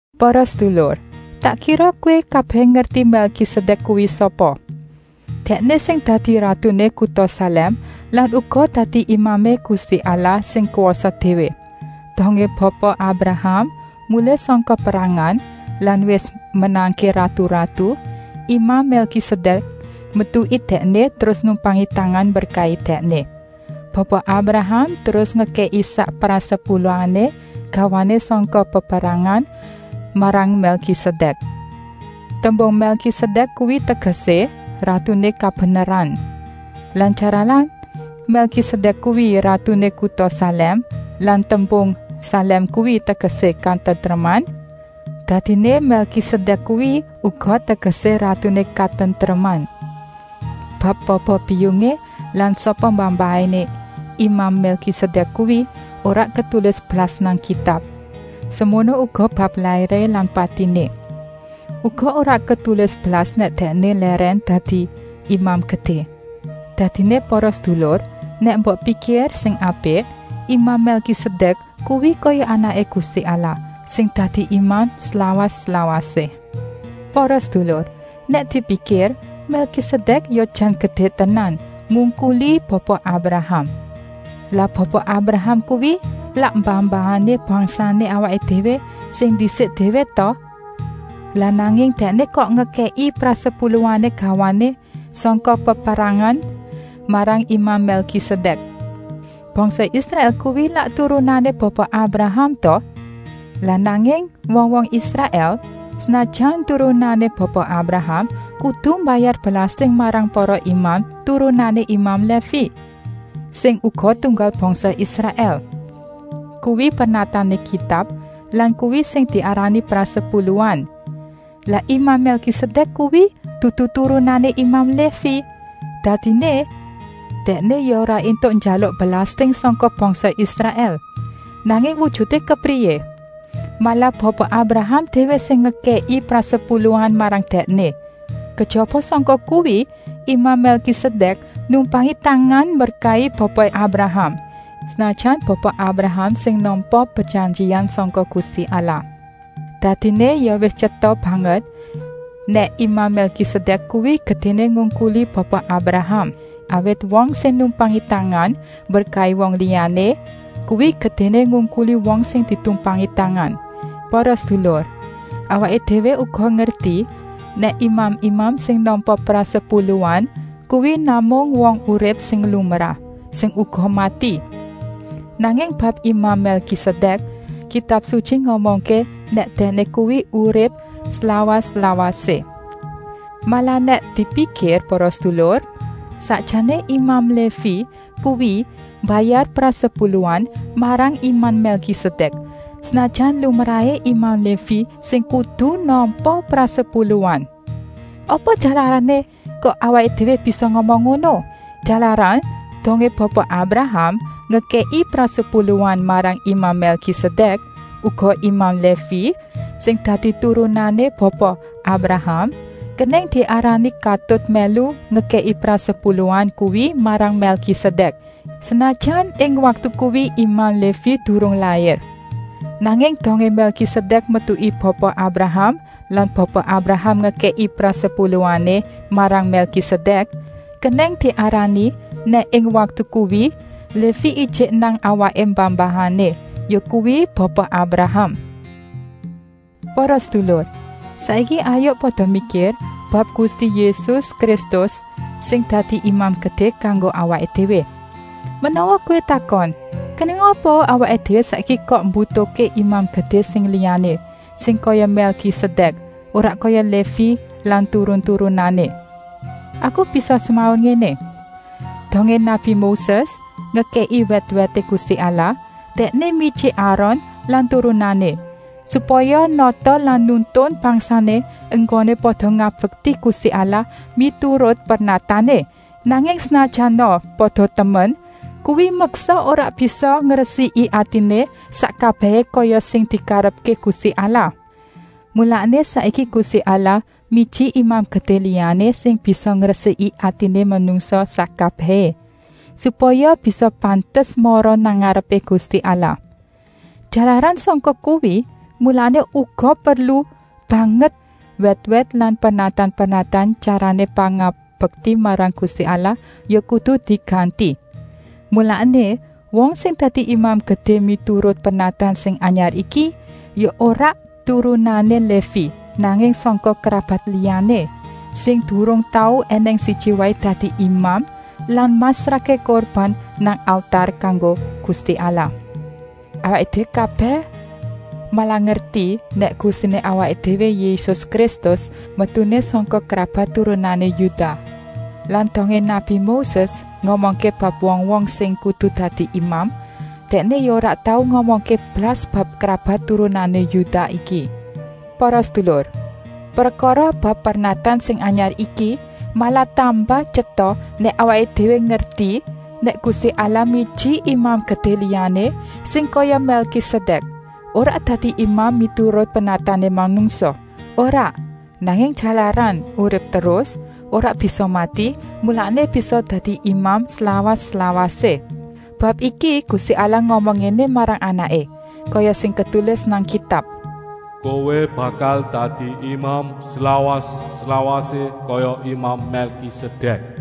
Para sedulur, tak kira kowé kabèh ngerti Mèlkisedèk kuwi sapa. Dèkné sing dadi ratuné kuta Salèm lan uga dadi imamé Gusti Allah sing kwasa déwé. Dongé Bapa Abraham mulih sangka perangan lan wis menangké ratu-ratu, imam Mèlkisedèk metuki dèkné terus numpangi tangan mberkahi dèkné. Bapa Abraham terus ngekèki sak prasepuluhané gawané sangka peperangan marang Mèlkisedèk. Tembung Mèlkisedèk kuwi tegesé “ratuné kabeneran”. Lan jalaran Mèlkisedèk kuwi ratuné kuta Salèm lan tembung Salèm kuwi tegesé “katentreman”, dadiné Mèlkisedèk kuwi uga tegesé “ratuné katentreman”. Bab bapa-biyungé lan sapa mbah-mbahané imam Mèlkisedèk kuwi ora ketulis blas nang Kitab, semono uga bab lairé lan patiné. Uga ora ketulis blas nèk dèkné lèrèn dadi Imam Gedé. Dadiné para sedulur, nèk mbok pikir sing apik, imam Mèlkisedèk kuwi kaya Anaké Gusti Allah, sing dadi imam slawas-lawasé. Para sedulur, nèk dipikir Mèlkisedèk ya jan gedé tenan, ngungkuli Bapa Abraham. Lah Bapa Abraham kuwi lak mbah-mbahané bangsané awaké déwé sing ndisik déwé ta! Lah nanging dèkné kok ngekèki prasepuluhané gawané sangka peperangan marang imam Mèlkisedèk. Bangsa Israèl kuwi lak turunané Bapa Abraham ta? Lah nanging wong-wong Israèl, senajan turunané Bapa Abraham, kudu mbayar belasting marang para imam turunané imam Lévi, sing uga tunggal bangsa Israèl. Kuwi pernatané Kitab lan kuwi sing diarani prasepuluhan. Lah imam Mèlkisedèk kuwi dudu turunané imam Lévi, dadiné dèkné ya ora éntuk njaluk belasting sangka bangsa Israèl. Nanging wujuté kepriyé? Malah Bapa Abraham déwé sing ngekèki prasepuluhan marang dèkné. Kejaba sangka kuwi, imam Mèlkisedèk numpangi tangan mberkahi Bapa Abraham, senajan Bapa Abraham sing nampa prejanjian sangka Gusti Allah. Dadiné ya wis tyeta banget nèk imam Mèlkisedèk kuwi gedéné ngungkuli Bapa Abraham, awit wong sing numpangi tangan mberkahi wong liyané kuwi gedéné ngungkuli wong sing ditumpangi tangan. Para sedulur, awaké déwé uga ngerti nèk imam-imam sing nampa prasepuluhan kuwi namung wong urip sing lumrah, sing uga mati. Nanging bab imam Mèlkisedèk Kitab Sutyi ngomongké nèk dèkné kuwi urip slawas-lawasé. Malah nèk dipikir para sedulur, sakjané imam Lévi kuwi mbayar prasepuluhan marang imam Mèlkisedèk, senajan lumrahé imam Lévi sing kudu nampa prasepuluhan. Apa jalarané kok awaké déwé bisa ngomong ngono? Jalaran dongé Bapa Abraham ngekèki prasepuluhan marang imam Mèlkisedèk, uga imam Lévi, sing dadi turunané Bapa Abraham, kenèng diarani katut mèlu ngekèki prasepuluhan kuwi marang Mèlkisedèk. Senajan ing waktu kuwi imam Lévi durung lair, nanging dongé Mèlkisedèk metuki Bapa Abraham lan Bapa Abraham ngekèki prasepuluhané marang Mèlkisedèk, kenèng diarani nèk ing waktu kuwi Lévi ijik nang awaké mbah-mbahané, yakuwi Bapa Abraham. Para sedulur, saiki hayuk pada mikir bab Gusti Yésus Kristus sing dadi Imam Gedé kanggo awaké déwé. Menawa kowé takon: “Kenèng apa awaké déwé saiki kok mbutuhké Imam Gedé sing liyané, sing kaya Mèlkisedèk, ora kaya Lévi lan turun-turunané?” Aku bisa semaur ngéné: dongé nabi Moses ngekèki wèt-wèté Gusti Allah, dèkné miji Aron lan turunané, supaya nata lan nuntun bangsané enggoné pada ngabekti Gusti Allah miturut pernatané. Nanging senajana pada temen, kuwi meksa ora bisa ngresiki atiné sak kabèhé kaya sing dikarepké Gusti Allah. Mulané saiki Gusti Allah miji Imam Gedé liyané sing bisa ngresiki atiné manungsa sak kabèhé, supaya bisa pantes mara nang ngarepé Gusti Allah. Jalaran sangka kuwi, mulané uga perlu banget wèt-wèt lan pernatan-pernatan tyarané pangabekti marang Gusti Allah ya kudu diganti. Mulané, wong sing dadi Imam Gedé miturut pernatan sing anyar iki ya ora turunané Lévi, nanging sangka krabat liyané, sing durung tau ènèng siji waé dadi imam lan masrahké kurban nang altar kanggo Gusti Allah. Awaké déwé kabèh malah ngerti nèk Gustiné awaké déwé Yésus Kristus metuné sangka krabat turunané Yudah. Lan dongé nabi Moses ngomongké bab wong-wong sing kudu dadi imam, dèkné ya ora tau ngomongké blas bab krabat turunané Yudah iki. Para sedulur, prekara bab pernatan sing anyar iki malah tambah tyeta nèk awaké déwé ngerti, nèk Gusti Allah miji Imam Gedé liyané, sing kaya Mèlkisedèk, ora dadi imam miturut pernatané manungsa, ora, nanging jalaran urip terus, ora bisa mati, mulané bisa dadi imam slawas-lawasé. Bab iki Gusti Allah ngomong ngéné marang Anaké, kaya sing ketulis nang Kitab: “Kowé bakal dadi Imam slawas-lawasé, kaya imam Mèlkisedèk.”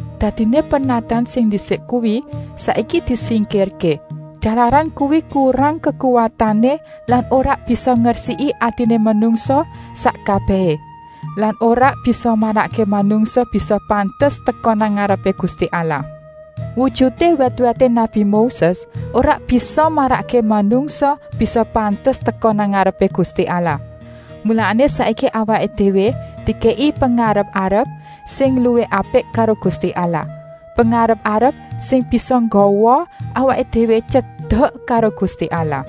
Dadiné pernatan sing ndisik kuwi saiki disingkirké, jalaran kuwi kurang kekuwatané lan ora bisa ngresiki atiné manungsa sak kabèhé lan ora bisa marakké manungsa bisa pantes teka nang ngarepé Gusti Allah. Wujuté wèt-wèté nabi Moses ora bisa marakké manungsa bisa pantes teka nang ngarepé Gusti Allah. Mulané saiki awaké déwé dikèki pengarep-arep sing luwih apik karo Gusti Allah, pengarep-arep sing bisa nggawa awaké déwé tyedek karo Gusti Allah.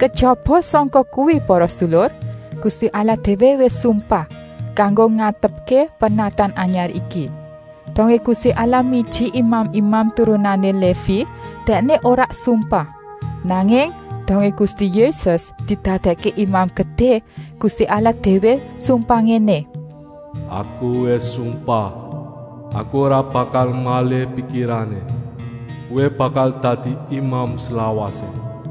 Kejaba sangka kuwi para sedulur, Gusti Allah déwé wis sumpah, kanggo ngantepké pernatan anyar iki. Dongé Gusti Allah miji imam-imam turunané Lévi, Dèkné ora sumpah. Nanging dongé Gusti Yésus didadèkké Imam Gedé, Gusti Allah déwé sumpah ngéné: “Aku wis sumpah, Aku ora bakal malih pikirané. Kowé bakal dadi Imam slawasé.”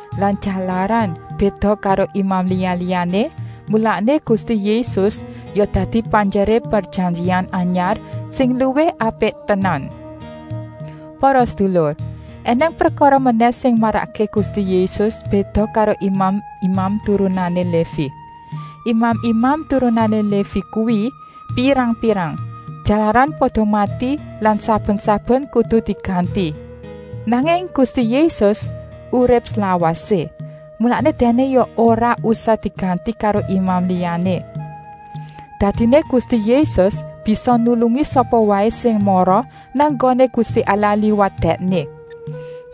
Lan jalaran béda karo imam liya-liyané, mulané Gusti Yésus ya dadi panjeré prejanjian anyar sing luwih apik tenan. Para sedulur, ènèng prekara menèh sing marakké Gusti Yésus béda karo imam-imam turunané Lévi. Imam-imam turunané Lévi kuwi pirang-pirang, jalaran pada mati lan saben-saben kudu diganti. Nanging Gusti Yésus urip slawasé, mulané Dèkné ya ora usah diganti karo imam liyané. Dadiné Gusti Yésus bisa nulungi sapa waé sing mara nang nggoné Gusti Allah liwat Dèkné.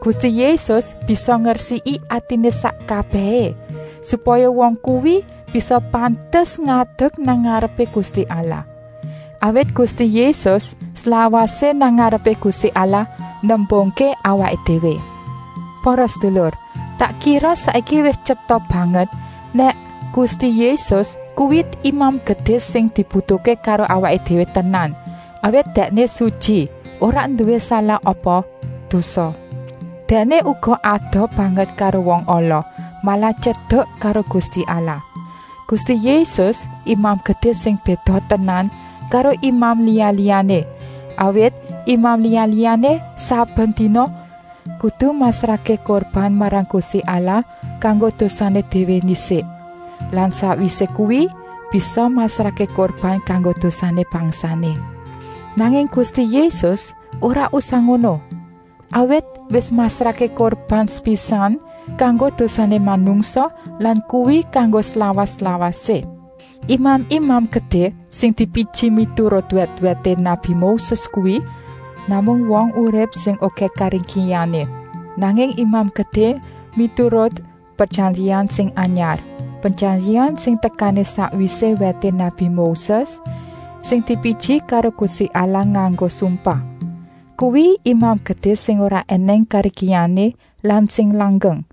Gusti Yésus bisa ngresiki atiné sak kabèhé, supaya wong kuwi bisa pantes ngadek nang ngarepé Gusti Allah. Awit Gusti Yésus slawasé nang ngarepé Gusti Allah nembungké awaké déwé. Para sedulur, tak kira saiki wis tyeta banget nèk Gusti Yésus kuwi Imam Gedé sing dibutuhké karo awaké déwé tenan, awit Dèkné sutyi, ora nduwé salah apa dosa. Dèkné uga adoh banget karo wong ala, malah tyedek karo Gusti Allah. Gusti Yésus Imam Gedé sing béda tenan karo imam liya-liyané, awit imam liya-liyané saben dina kudu masrahké kurban marang Gusti Allah kanggo dosané déwé ndisik lan sakwisé kuwi bisa masrahké kurban kanggo dosané bangsané. Nanging Gusti Yésus ora usah ngono, awit wis masrahké kurban sepisan kanggo dosané manungsa lan kuwi kanggo slawas-lawasé. Imam-imam Gedé sing dipiji miturut wèt-wèté nabi Moses kuwi namung wong urip sing okèh karingkihané. Nanging Imam Gedé miturut prejanjian sing anyar, prejanjian sing tekané sakwisé wèté nabi Moses, sing dipiji karo Gusti Allah nganggo sumpah, kuwi Imam Gedé sing ora ènèng karingkihané lan sing langgeng,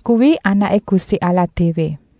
kuwi Anaké Gusti Allah déwé.